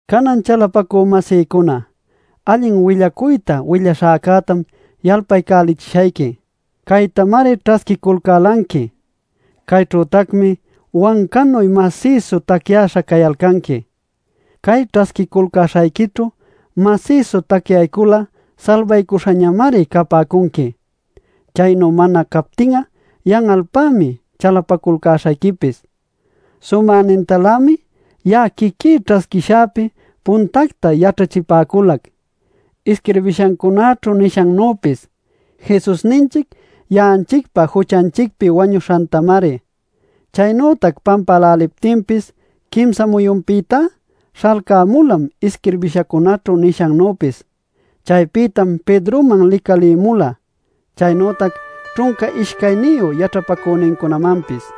Canan chalapacü-masïcuna, allin willacuyta willaśhäcätam yalpalcälichishayqui. Caytamari ćhasquiculcälanqui. Cayćhütacmi wancanuy masïsu tacyäśha cayalcanqui. Cay ćhasquiculcäśhayquićhu masïsu tacyaycul'a salbaycuśhañamari capäcunqui. Chaynu mana captin'a yan'alpämi chalapaculcäśhayquipis. Sumänintalämi ya'a quiquí ćhasquishäpi puntacta yaćhachipäculac: isquirbishancunaćhu nishannüpis, Jesusninchic ya'anchicpa juchanchicpi wañuśhantamari. Chaynütac pampäläliptinpis quimsa muyunpïtá śhalcämulam isquirbishancunaćhu nishannüpis. Chaypïtam Pedroman licalïmula chaynütac ćhunca ishcayniyu yaćhapacünincunamanpis.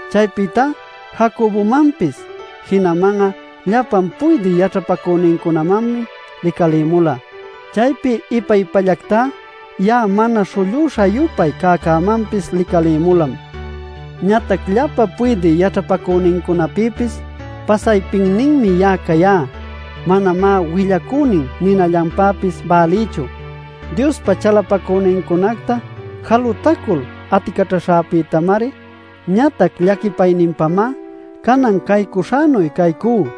Chaypïta Jacobomanpis, jinaman'a llapan puydï yaćhapacünincunamanmi licalïmula. Chaypi ipa-ipallactá ya'a mana śhullüśha-yupay cäcämanpis licalïmulam. Ñatac llapa puydï yaćhapacünincunapïpis pasaypinninmi ya'a cayá. Manamá willacünin ninallanpäpis bälïchu, Diospa chalapacünincunacta jalutacul aticaćhaśhäpïtamari. Ñatac llaquipayninpamá canan caycuśhänuy caycú.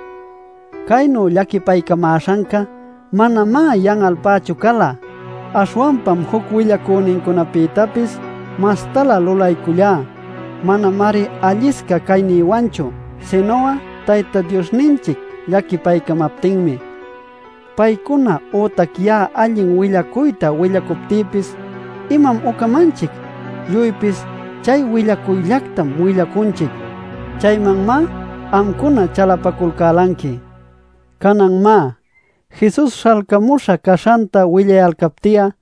Caynu llaquipaycamäśhanca manamá yan'alpächu cala. Aśhwanpam juc willacünincunapïtapis mastalä lulaycullá. Manamari allisca caynïwanchu sinu'a Tayta Diosninchic llaquipaycamaptinmi. ¿Paycuna ütac ya'a allin willacuyta willacuptïpis imam ucamanchic? Lluypis chay willacuyllactam willacunchic, chaymanmá amcuna chalapaculcälanqui. Canan má, Jesus śhalcamuśha caśhanta willayalcapti'a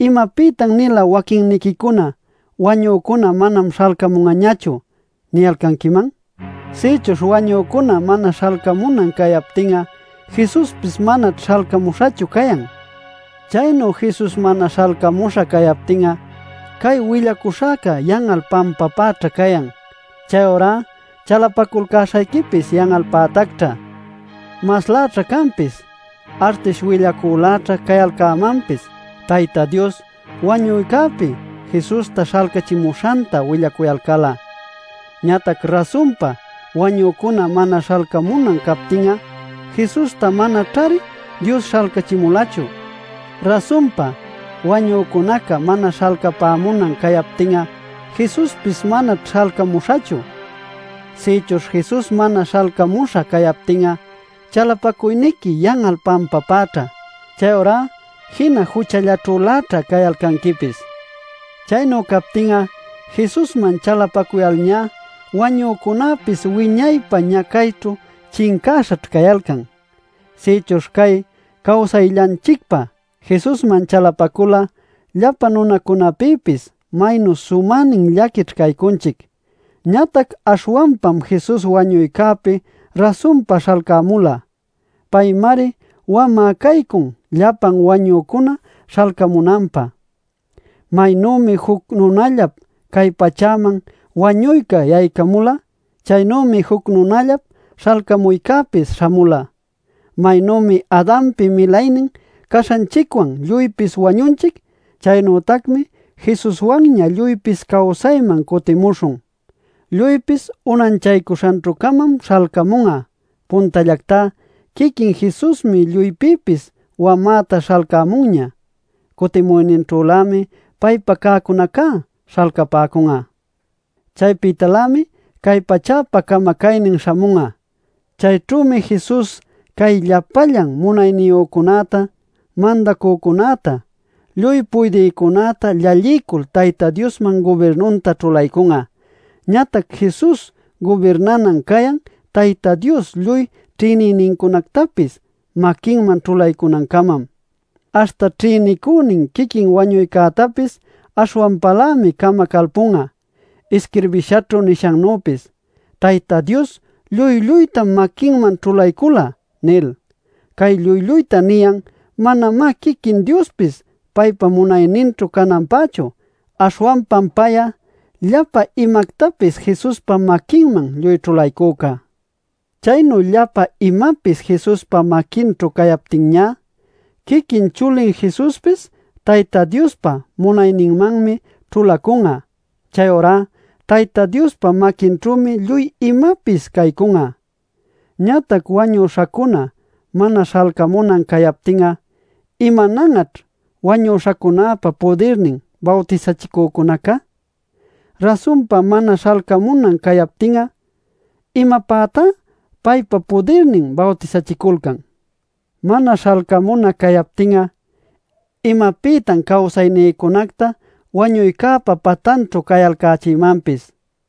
¿imapïtan-nila waquinniquicuna “Wañücuna manam śhalcamun'añachu” niyalcanquiman? Sïchuśh wañücuna mana śhalcamunan cayaptin'a, Jesuspis manaćh śhalcamuśhachu cayan. Chaynu Jesus mana śhalcamuśha cayaptin'a cay willacuśhäca yan'al pampapäćha cayan. Chayurá chalapaculcäśhayquipis yan'alpätacćhá. Masläćha canpis, artish willacüläćha cayalcämanpis Tayta Dios wañuycäpi Jesusta śhalcachimuśhanta willacuyalcal'a. Ñatac rasunpa wañücuna mana śhalcamunan cayaptin'a Jesusta manaćhari Dios śhalcachimulachu. Rasunpa, wañücunaca mana śhalcapämunan cayaptin'a Jesuspis manaćh śhalcamuśhachu. Sïchuśh Jesus mana śhalcamuśha cayaptin'a chalapacuyniqui yan'al pampapäćha. Chayurá jina juchallaćhüläćha cayalcanquipis. Chaynu captin'a Jesusman chalapacuyalñá wañücunäpis wiñaypä ñacayćhu chincäśhaćh cayalcan. Sïchuśh cay cawsayllanchicpä Jesusman chalapacul'a ¡llapa nunacunapïpis maynu sumänin llaquićh caycunchic! Ñatac aśhwanpam Jesus wañuycäpi rasunpa śhalcämula. Paymari wamä caycun llapan wañücuna śhalcamunanpä. Maynümi juc nunallap cay pachäman wañuyca yaycamula, chaynümi juc nunallap śhalcamuycäpis śhamula. Maynümi Adanpi milaynin caśhanchicwan lluypis wañunchic; Chaynütacmi Jesuswanña lluypis cawsayman cutimuśhun. Lluypis unanchaycuśhanćhü-camam śhalcamun'a: puntallactá quiquin Jesusmi lluypïpis wamäta śhalcämunña. Cutimuyninćhülämi paypa cäcunacá śhalcapäcun'a. Chaypïtalämi cay pachäpa camacaynin śhamun'a. Chayćhümi Jesus cay llapallan munayniyücunäta, mandacücunäta, lluy puydïcunäta llallilcul Tayta Diosman gubirnunta ćhulaycun'a. Ñatac Jesus gubirnanan cayan Tayta Dios lluy ćhïnïnincunactapis maquinman ćhulaycunancamam. Aśhta ćhïnicünin quiquin wañuycätapis aśhwanpalämi camacalpun'a, isquirbishaćhu nishannüpis “Tayta Dios lluy-lluytam maquinman ćhulaycula” nil. Cay “lluy-lluyta” niyan manamá quiquin Diospis paypa munayninćhu cananpächu. Aśhwanpam pay'a llapa imactapis Jesuspa maquinman lluy ćhulaycüca. Chaynu llapa imapis Jesuspa maquinćhu cayaptinñá, quiquin chulin Jesuspis Tayta Diospa munayninmanmi ćhulacun'a. Chayurá Tayta Diospa maquinćhümi lluy imapis caycun'a. Ñatac wañüśhacuna mana śhalcamunan cayaptin'a, ¿imanan'aćh “wañüśhacunäpa pudirnin” bawtisachicücunaca? Rasunpa mana śhalcamunan cayaptin'a ¿imapätá paypa pudirnin bawtisachiculcan? Mana śhalcamuna cayaptin'a ¿imapïtan cawsaynïcunacta wañuycäpa patanćhu cayalcächïmanpis?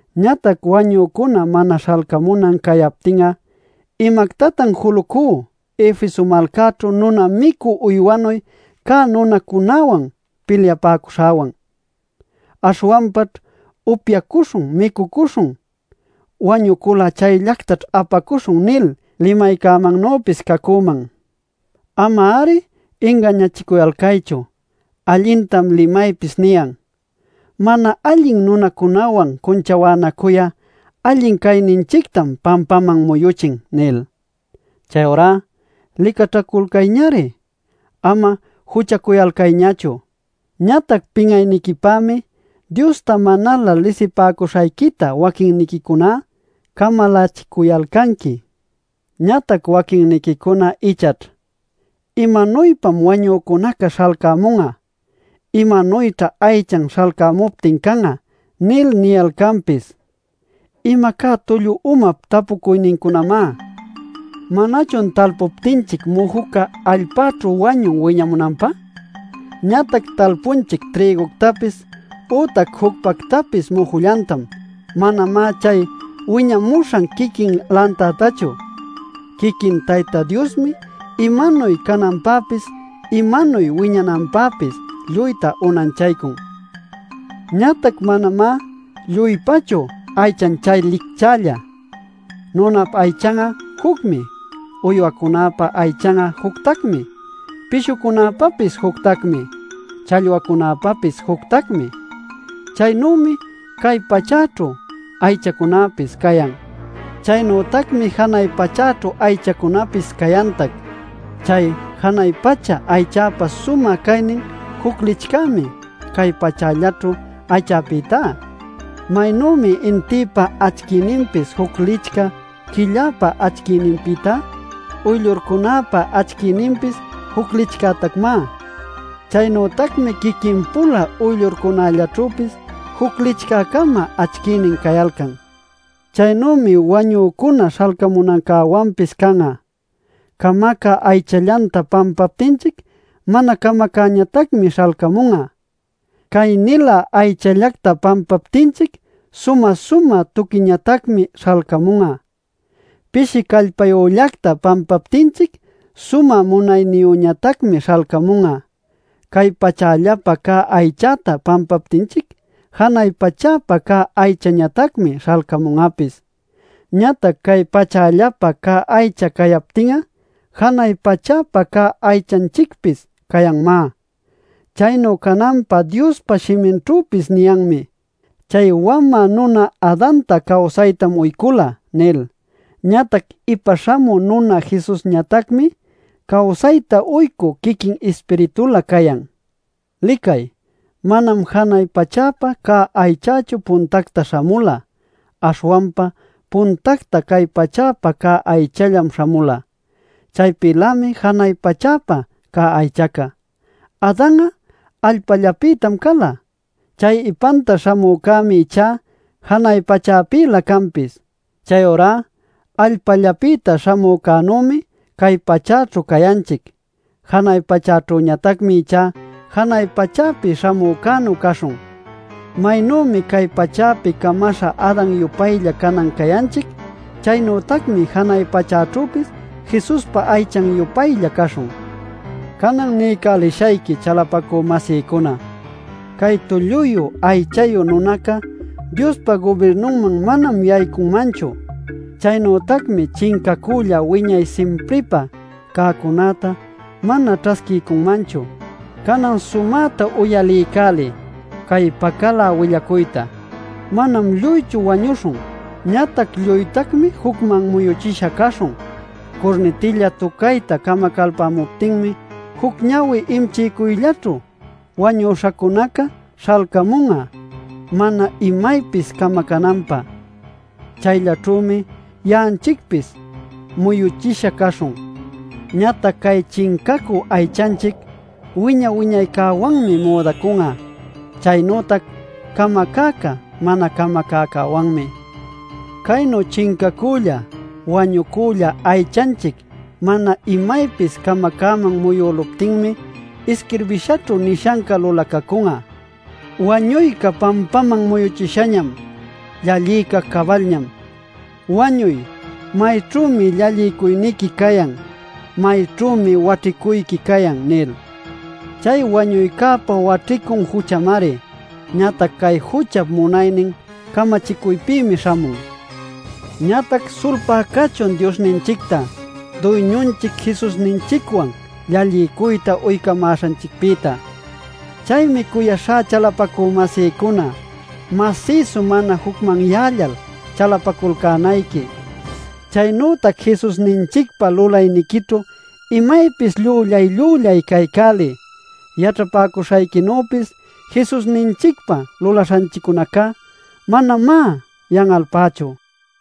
Ñatac wañücuna mana śhalcamunan cayaptin'a ¿imactatan julucú Efeso malcaćhu nuna-micü uywanuy cä nunacunäwan pilyapäcuśhäwan? Aśhwanpaćh “Upyacuśhun, micucuśhun, wañucul'a chayllactaćh apacuśhun” nil limaycämannüpis cacüman. ¡Ama-ari ingañachicuyalcaychu! Allintam limaypis niyan: “Mana allin nunacunäwan cunchawänacuy'a allin cayninchictam pampaman muyuchin” nil. Chayurá licaćhaculcayñari; ama juchacuyalcayñachu. Ñatac pin'ayniquipämi Diosta manalä lisipäcuśhayquita waquinniquicuná camalachicuyalcanqui. Ñatac waquincuna ichaćh: “¿Imanuypam wañücunaca śhalcamun'a? ¿Imanuyćha aychan śhalcamuptin can'a?” nil niyalcanpis. ¡Imacá tullu umap tapucuynincunamá! ¿Manachun talpuptinchic mujuca allpäćhu wañun wiñamunanpä? Ñatac talpunchic trïguctapis ütac jucpactapis mujullantam, manamá chay wiñamuśhan quiquin lantantachu. Quiquin Tayta Diosmi imanuy cananpäpis imanuy wiñananpäpis lluyta unanchaycun. Ñatac manamá lluypachu aychan chay licchälla: nunap aychan'a jucmi, uywacunäpa aychan'a juctacmi, pishucunäpapis juctacmi, challwacunäpapis juctacmi. Chaynümi cay pachäćhu aychacunapis cayan; chaynütacmi janay pachäćhu aychacunapis cayantac. Chay janay pacha aychäpa sumä caynin juc licchämi cay pachällaćhu aychapïtá. Maynümi intïpa acchiyninpis juc licchä quillapa acchiyninpïta; uyllurcunäpa acchiyninpis juc licchätacmá. Chaynütacmi quiquin-pula uyllurcunallaćhüpis juc licchä-cama acchiynin cayalcan. Chaynümi wañücuna śhalcamunancäwanpis can'a: camacä aychallacta pampaptinchic mana camacäñatacmi śhalcamun'a. Cay-nilä aychallacta pampaptinchic sumä-sumä tuquiñatacmi śhalcamun'a. Pishi callpayüllacta pampaptinchic sumä munayniyüñatacmi śhalcamun'a. Cay pachällapä cä aychacta pampaptinchic janay pachäpä cä aychañatacmi śhalcamun'apis. Ñatac cay pachällapä cä aycha cayaptin'a, janay pachäpä cä aychanchicpis cayanmá. Chaynu cananpä Diospa shiminćhüpis niyanmi: “Chay wamä nuna Adanta cawsaytam uycula” nil. Ñatac ipa śhamü nuna Jesusñatacmi cawsayta uycü quiquin Ispiritulä cayan. Licay, manam janay pachäpä cä aychachu puntactá śhamula. Aśhwanpa puntacta cay pachäpä cä aychallam śhamula; chaypïlämi janay pachäpä cä aychaca. Adan'a allpallapïtam cala. Chay ipanta śhamücämi ichá janay pachäpïlä canpis. Chayurá allpällapïta śhamücänümi cay pachäćhu cayanchic. Janay pachäćhüñatacmi ichá janay pachäpi śhamücänu caśhun. Maynümi cay pachäpi camaśha Adan-yupaylla canan cayanchic; chaynütacmi janay pachäćhüpis Jesuspa aychan-yupaylla caśhun. Canan niycälishayqui chalapacü-masïcuna: Cay tulluyu aychayu nunacá Diospa gubirnunman manam yaycunmanchu. Chaynütacmi chincacücälla wiñay simpripä cäcunäta mana ćhasquiycunmanchu. Canan sumäta uyaliycäliy cay pacalä willacuyta: Manam lluychu wañuśhun. Ñatac lluytacmi jucman muyuchisha caśhun. Curnitilla tucayta camacalpamuptinmi juc ñawi imchiycuyllaćhu, wañuśhacunaca śhalcamun'a mana imaypis camacananpä; chayllaćhümi ya'anchicpis muyuchisha caśhun. Ñatac cay chincacü aychanchic, wiña-wiñaycäwanmi müdacun'a, chaynütac camacäca mana camacäcäwanmi. Caynu chincacülla, wañucülla aychanchic mana imaypis camacäman muyüluptinmi isquirbishanćhu nishanca lulacacun'a: “¡Wañuyca pampaman muyuchishañam; llalliyca cabalñam!” “Wañuy, ¿mayćhümi llallicuyniqui cayan? ¿Mayćhümi waćhicuyqui cayan?” nil. Chay wañuycäpa waćhicun juchamari, ñatac cay juchap munaynin camachicuypïmi śhamun. ¡Ñatac sulpá cachun Diosninchicta, Duyñunchic Jesusninchicwan llalliycuyta uycamäśhanchicpïta! Chaymi cuyaśhá chalapacü-masïcuna, masïsu mana jucmanyällal chalapaculcänayqui. Chaynütac Jesusninchicpä lulayniquićhu imaypis llüllay-llüllay caycäliy. Yaćhapäcuśhayquinüpis Jesusninchicpa lulaśhanchiccunaca manamá yan'alpächu.